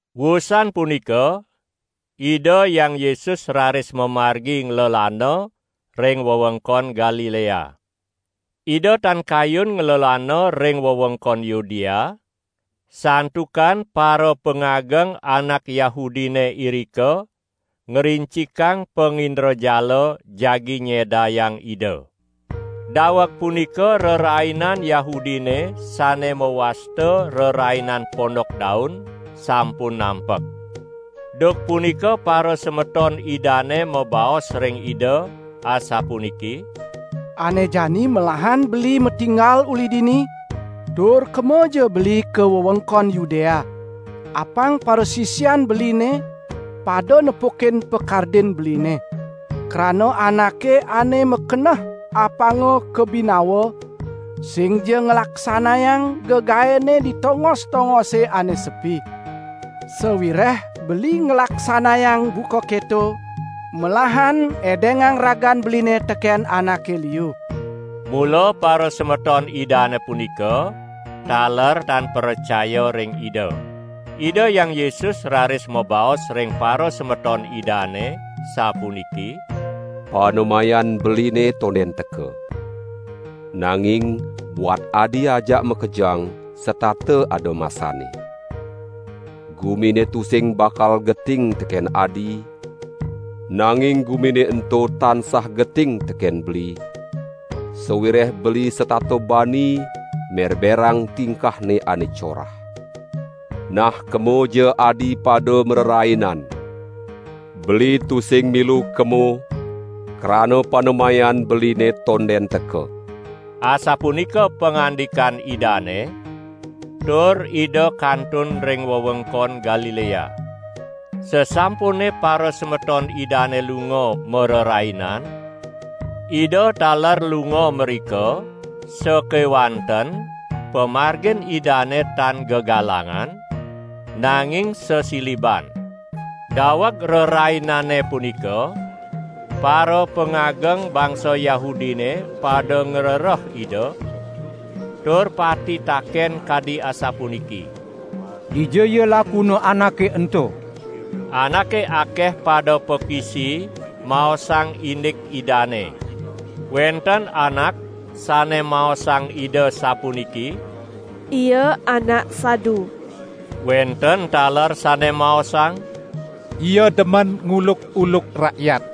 Wusan punika Ida Hyang Yesus raris mamargi nglelana ring wewengkon Galilea. Ida tan kayun nglelana ring wewengkon Yudea, santukan parapangageng anak Yahudine irika ngrincikang pangindrajala jagi nyedayang Ida. Daweg punika rerainan Yahudine sane mawasta Rerainan Pondok Daun sampun nampek. Duk punika parasemeton Idane mabaos ring Ida asapuniki: "Ane jani melahan beli matinggal uli dini, tur kemaja beli ka wewengkon Yudea, apang parasisian beline pada nepukin pakardin beline. Krana anake ane makeneh apanga kabinawa, singja nglaksanayang gegaenne di tongos-tongose ane sepi. Sawireh beli nglaksanayang buka keto melahan edengang ragan beline teken anake liu!" ( Mula parasemeton Idane punika taler tan pracaya ring Ida.) Ida Hyang Yesus raris mabaos ring parasemeton Idane sapuniki: "Panemayan Beline tonden teka. Nanging buat adi ajak makejang setata ada masanne. Gumine tusing bakal geting teken adi, nanging gumine ento tansah geting teken Beli, sawireh Beli setata bani merberang tingkahne ane corah. Nah kemaja adi pada marerainan. Beli tusing milu kemo, krana panemayan Beline tonden teka." Asapunika pangandikan Idane, tur Ida kantun ring wewengkon Galilea. Sasampune parasemeton Idane lunga marerainan, Ida taler lunga mrika sakewanten pamargin Idane tan gegalangan, nanging sesiliban. Daweg rerainane punika, parapangageng bangsa Yahudine pada ngrereh Ida tur pati taken kadi asapuniki: "Dija ya lakuna Anake ento?" Anake akeh pada pakisi maosang indik Idane. Wenten anak sane maosang Ida sapuniki: "Ia anak sadu!" Wenten taler sane maosang: "Ia demen nguluk-uluk rakyat."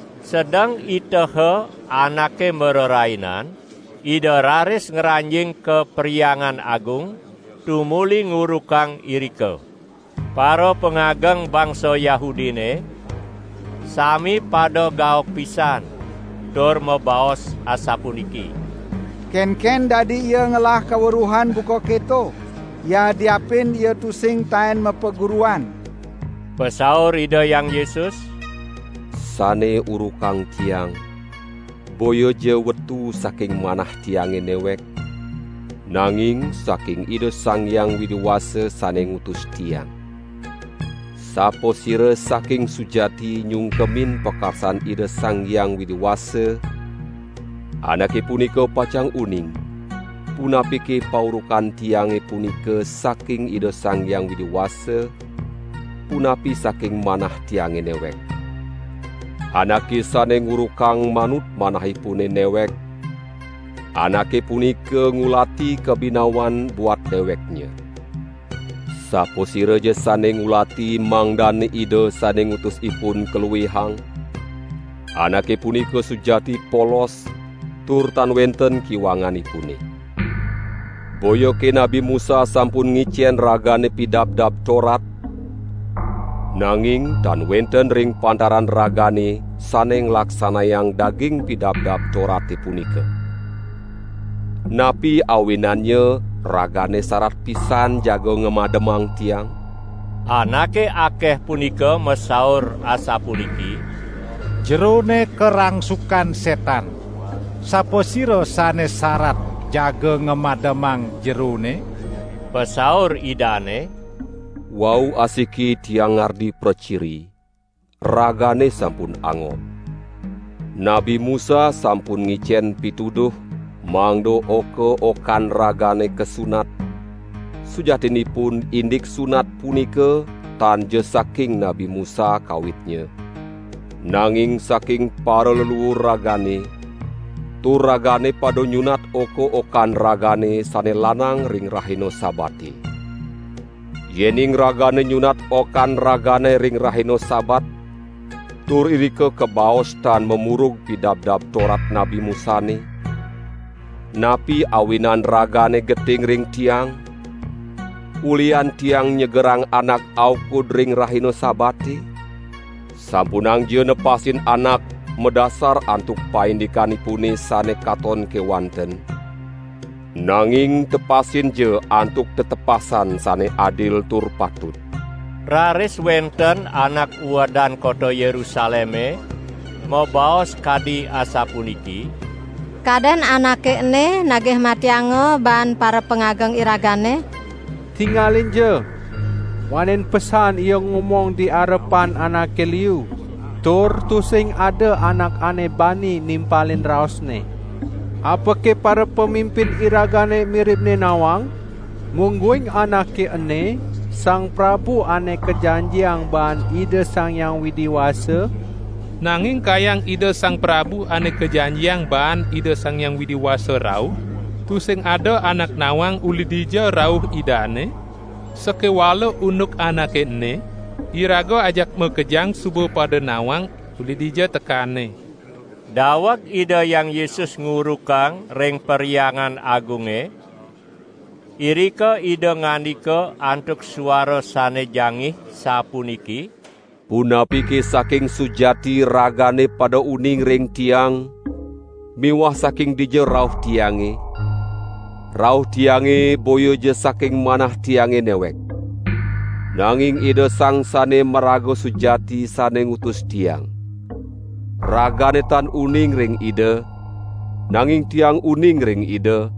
Sedeng iteha anake marerainan, Ida raris ngranjing ka Perhyangan Agung, tumuli ngurukang irika. Parapangageng bangsa Yahudine sami pada gaok pisan tur mabaos asapuniki: "Kenken dadi ia ngelah kaweruhan buka keto, yadiapin Ia tusing taen mapaguruan?" Pasaur Ida Hyang Yesus: "Sane urukang Tiang boyaja wetu saking manah Tiange newek, nanging saking Ida Sang Hyang Widi Wasa sane ngutus Tiang. Sapasira saking sujati nyungkemin pakarsan Ida Sang Hyang Widi Wasa, anake punika pacang uning, punapike paurukan Tiange punika saking Ida Sang Hyang Widi Wasa, punapi saking manah Tiange newek. Anake sane ngurukang manut manahipune newek, anake punika ngulati kabinawan buat deweknya. Sapasiraja sane ngulati mangdane Ida sane ngutus ipun kaluihang, anake punika sujati polos tur tan wenten kiwanganipune. Boyake Nabi Musa sampun ngicen ragane Pidabdab Torat? Nanging tan wenten ring pantaran ragane sane nglaksanayang daging Pidabdab Torate punika. Napi awinannya ragane sarat pisan jaga ngamademang Tiang?" Anake akeh punika masaur asapuniki: "Jerone karangsukan setan. Sapasira sane sarat jaga ngamademang Jerone?" Pasaur Idane: "Wau asiki Tiang ngardi praciri, ragane sampun angob. Nabi Musa sampun ngicen pituduh mangda oka-okan ragane kasunat, sujatinipun indik sunat punika tanja saking Nabi Musa kawitnya nanging saking paraleluur ragane, tur ragane pada nyunat oka-okan ragane sane lanang ring rahina Sabate. Yening ragane nyunat okan ragane ring rahina Sabat tur irika kabaos tan mamurug Pidabdab Torat Nabi Musane, napi awinan ragane geting ring Tiang, ulihan Tiang nyegerang anak aukud ring rahina Sabate? Sampunangja nepasin anak madasar antuk paindikanipune sane katon kewanten, nanging tepasinja antuk tetepasan sane adil tur patut." Raris wenten anak uedan kota Yerusaleme mabaos kadi asapuniki: "Kaden Anake ene nagih matianga baan parapangageng iragane? Tingalinja! Wanen pesan Ia ngomong di arepan anake liu tur tusing ada anak ane bani nimpalin raosNe. Apake parapamimpin iragane miribne nawang, mungguing Anake ene Sang Prabu Ane Kajanjiang baan Ida Sang Hyang Widi Wasa? Nanging kayang Ida Sang Prabu Ane Kajanjiang baan Ida Sang Hyang Widi Wasa rauh, tusing ada anak nawang uli dija rauh Idane, sakewala unduk Anake ene, iraga ajak makejang suba pada nawang uli dija tekanNe." Daweg Ida Hyang Yesus ngurukang ring Perhyangan Agunge, irika Ida ngandika antuk suara sane jangih sapuniki: "Punapike saking sujati ragane pada uning ring Tiang miwah saking dija rauh Tiange? Rauh Tiange boyaja saking manah Tiange newek. Nanging Ida Sang Sane Maraga Sujati sane ngutus Tiang. Ragane tan uning ring Ida, nanging Tiang uning ring Ida,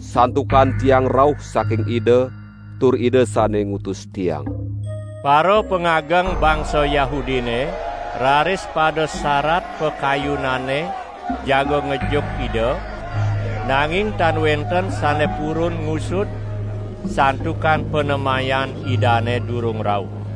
santukan Tiang rauh saking Ida tur Ida sane ngutus Tiang." Parapangageng bangsa Yahudine raris pada sarat pakayunanne jaga ngejuk Ida, nanging tan wenten sane purun ngusud; santukan panemayan Idane durung rauh.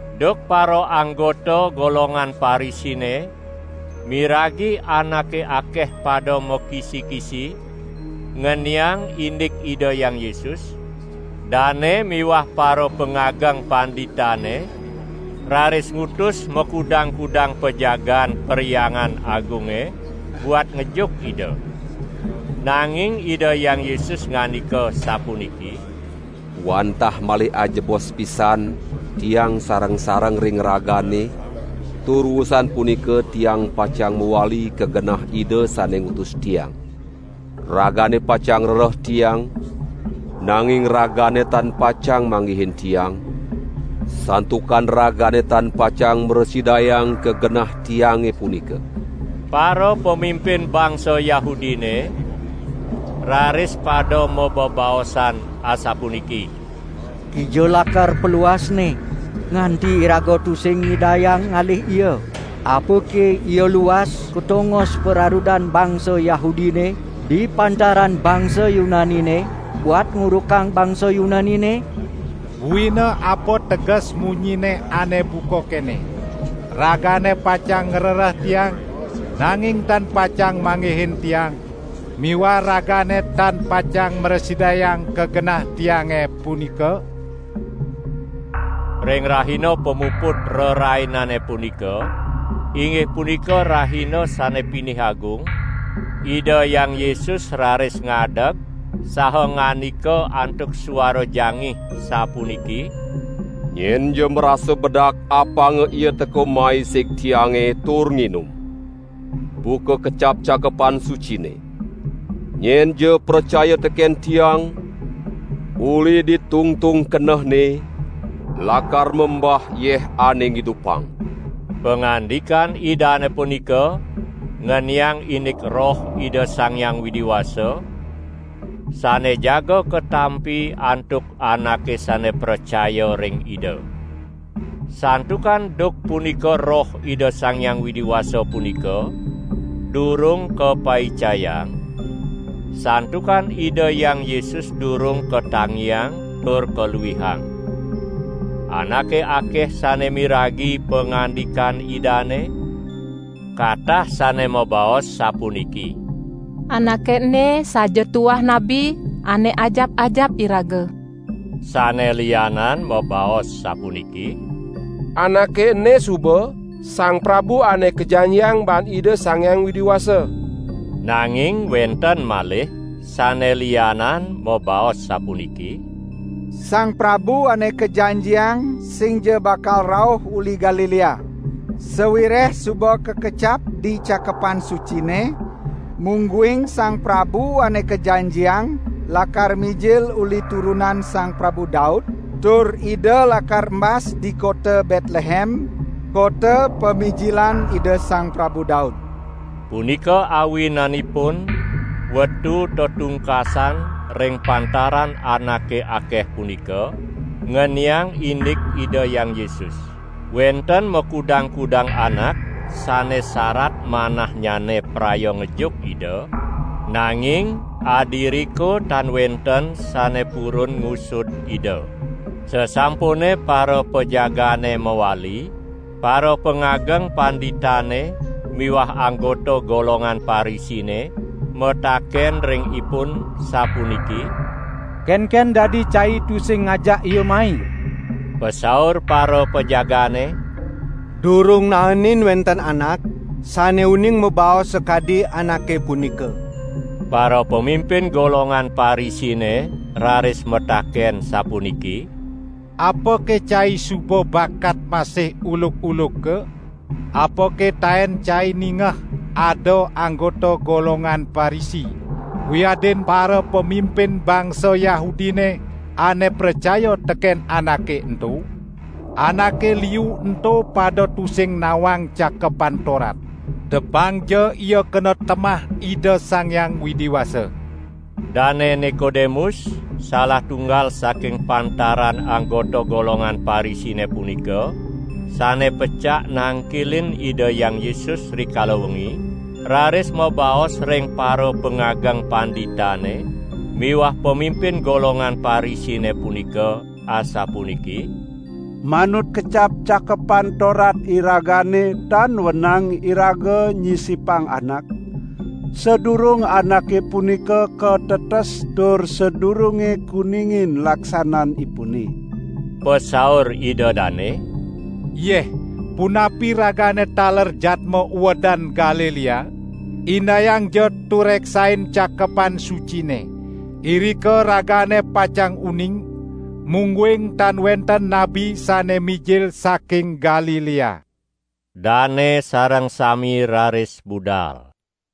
Duk paraanggota golongan Parisine miragi anake akeh pada makisi-kisi ngeniang indik Ida Hyang Yesus, dane miwah parapangageng panditane raris ngutus makudang-kudang pajagaan Perhyangan Agunge buat ngejuk Ida. Nanging Ida Hyang Yesus ngandika sapuniki: "Wantah malih ajebos pisan Tiang sareng-sareng ring ragane tur wusan punika Tiang pacang mawali ka genah Ida sane ngutus Tiang. Ragane pacang ngrereh Tiang, nanging ragane tan pacang manggihin Tiang, santukan ragane tan pacang mrasidayang ka genah Tiange punika!" Parapamimpin bangsa Yahudine raris pada mabebaosan asapuniki: "Kija lakar paluasNe, nganti iraga tusing nyidayang ngalih Ia? Apake Ia luas ka tongos pararudan bangsa Yahudine di pantaran bangsa Yunanine buat ngurukang bangsa Yunanine? Buina apa teges munyinNe ane buka kene: Ragane pacang ngrereh Tiang, nanging tan pacang manggihin Tiang miwah ragane tan pacang mrasidayang ka genah Tiange punika?" Ring rahina pamuput rerainane punika, inggih punika rahina sane pinih agung, Ida Hyang Yesus raris ngadeg saha ngandika antuk suara jangih sapuniki: "Nyenja marasa bedak apanga ia teka mai sig Tiange tur nginum. Buka kecap Cakepan Sucine: 'Nyenja pracaya teken Tiang, uli di tungtung kenehne lakar membah yeh ane ngidupang.' " Pangandikan Idane punika ngeniang indik Roh Ida Sang Hyang Widi Wasa, sane jaga katampi antuk anake sane pracaya ring Ida. Santukan duk punika Roh Ida Sang Hyang Widi Wasa punika durung kapaicayang, santukan Ida Hyang Yesus durung katangiang tur kaluihang. Anake akeh sane miragi pangandikan Idane, katah sane mabaos sapuniki: "Anake ene saja tuah Nabi ane ajap-ajap iraga!" Sane lianan mabaos sapuniki: "Anake ene suba Sang Prabu Ane Kajanjiang baan Ida Sang Hyang Widi Wasa!" Nanging wenten malih sane lianan mabaos sapuniki: "Sang Prabu Ane Kajanjiang singja bakal rauh uli Galilea! Sawireh suba kakacap di Cakepan Sucine mungguing Sang Prabu Ane Kajanjiang lakar mijil uli turunan Sang Prabu Daud tur Ida lakar embas di kota Betlehem, kota pamijilan Ida Sang Prabu Daud!" Punika awinanipun wetu tetungkasan ring pantaran anake akeh punika ngeniang indik Ida Hyang Yesus. Wenten makudang-kudang anak sane sarat manahnyane praya ngejuk Ida, nanging adiriko tan wenten sane purun ngusud Ida. Sasampune parapajagaane mawali, parapangageng panditane miwah anggota golongan Parisine mataken ring ipun sapuniki: "Kenken dadi cai tusing ngajak Ia mai?" Pasaur parapajagaane: "Durung naenin wenten anak, sane uning mabaos sakadi Anake punika!" Parapamimpin golongan Parisine raris mataken sapuniki: "Apake cai suba bakat masih uluk-uluka? Apake taen cai ningeh ada anggota golongan Parisi wiadin parapamimpin bangsa Yahudine ane pracaya teken Anake ento? Anake liu ento pada tusing nawang Cakepan Torat. Depangja ia kena temah Ida Sang Hyang Widi Wasa!" Dane Nikodemus salah tunggal saking pantaran anggota golongan Parisine punika, sane pecak nangkilin Ida Hyang Yesus rikala wengi, raris mabaos ring parapangageng panditane miwah pamimpin golongan Parisine punika asapuniki: "Manut kecap Cakepan Torat iragane tan wenang iraga nyisipang anak, sadurung anake punika katetes tur sadurunge kuningin laksananipune." Pasaur ida dane: "Yeh, punapi ragane taler jadma uedan Galilea? Indayangja tureksain Cakepan Sucine, irika ragane pacang uning, mungguing tan wenten nabi sane mijil saking Galilea!" [ Dane sareng sami raris budal,